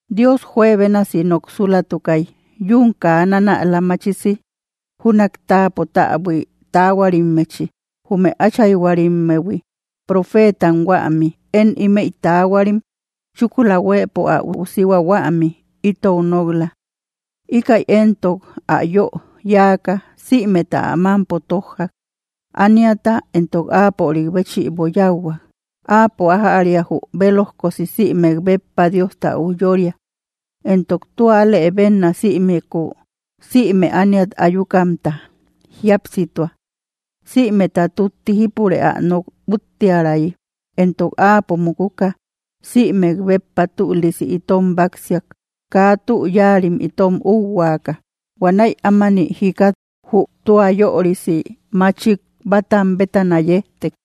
Dios juebénasi noksulatukay yún kaa nanäla machisi júnak táapo täbui taahuarimmechi, jume áchayhuarimmehui, profeetam huämi. Én ímëi taahuarim chúkula huëpo ä üusihua huämi, itou nok‑la. Íkäi éntok ä yö yáaka sïmeta ä mámpo tójjak; ániata éntok áapörik béchïbo yáuhuak. Áapo ájäria jü bélojkosi sïmek béppa Diosta ujyória, entok tua alëbenna sïmeku, sïme ániat ayukamta jíapsitua, sïmeta tútti jípure ä nok úttiärayi. Entok Áapo mukuka sïmek béppa tülisi itom báksiak, kaa tü yáarim itom úuhuaaka. Huanäi ámani jikat jü tua yörisi machik bátam bétana yejtek.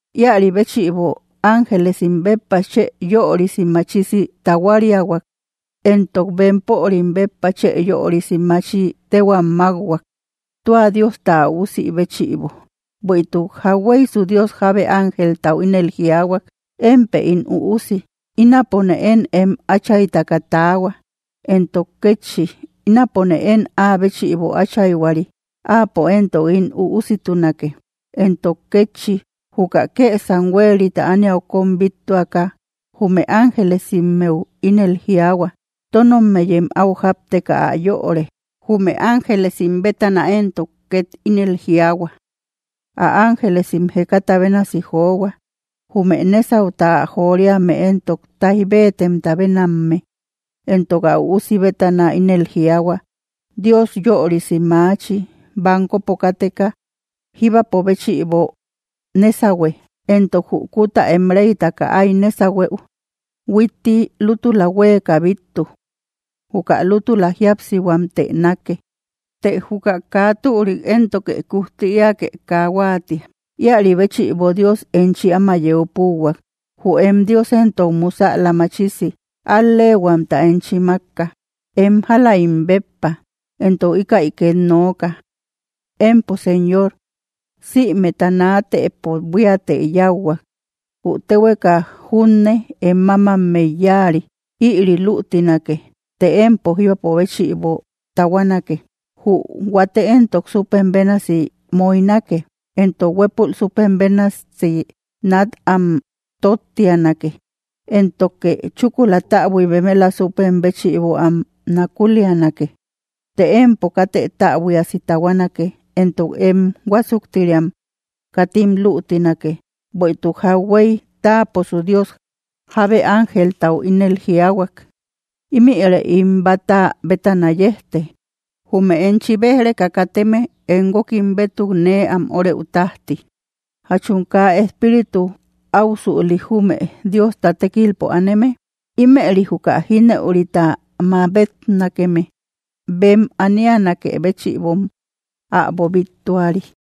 Íäri béchïbo ángelesim béppa chë yörisi machisi tahuariahuak, entok bempörim béppa chë yörisi machi téhuam mákhuak, tua Diosta ä üusi béchïbo. Bueïtuk, ¿jauhueysu Dios jabe ángeltau ínel jiaahuak: Émpë ín Üusi; ínapone én em Áchaytaka taahua? Entok kétchi: Ínapone én áa béchïbo áchayhuari; áapo éntok ín üussitunake. Entok kétchi, juka kësam huérita ániau kóm bíttuaka jume ángelesimmeu ínel jiaahua: Tónommeyem áu jápteka ä yöre. Jume ángelesim bétana éntok két ínel jiaahua: Ä ángelesim jekata bénasi johua; jume nésauta ä joriame éntok táij bétemta bénamme. Entok ä Üusi bétana ínel jiaahua: Dios yörisi machi bankopo káteka, jíbapo béchïbo nésahue, entok jü kuta em réytaka áy nésahueu huitti lútula huéeka bíttu. Juka lútula jíapsihuamtë nákke; të juka kaa türik éntoke kujti eäke kaa huáatia. Íäri bëchïbo Dios enchi áma yeu púuhuak. Jü em Dios éntok musäla machisi al‑leehuamta enchi mákka, em jáläim béppa. Entok íkäi két nooka: Empo, Señor, sïmeta naatëpo buíatë yáuhuak; jü téhueka junne em mámammey yáari. Ïri lütinake, të empo jíbapo béchïbo tahuanake; jü huate éntok súpem bénasi moynake. Entok huépul súpem bénasë nat am tóttianake, éntoke chúkula täbui bemela súpem béchïbo am nakulianake. Të empo katë täbuiasi tahuanake, entok em huásuktiriam katim lütinake. Bueïtuk jauhuey taaposu Dios, jábe ángeltau ínel jiaahuak: ¿Ímïre ín bata bétana yejte, jume enchi bej‑reka kateme em guókim bétuk nee am órëu tájti? ¿Jachum kaa espíritu áusüli, jume Diosta tékilpo aneme? Ímëri juka jínëurita mabetnakeme bem anianakë béchïbom äbo bíttuari.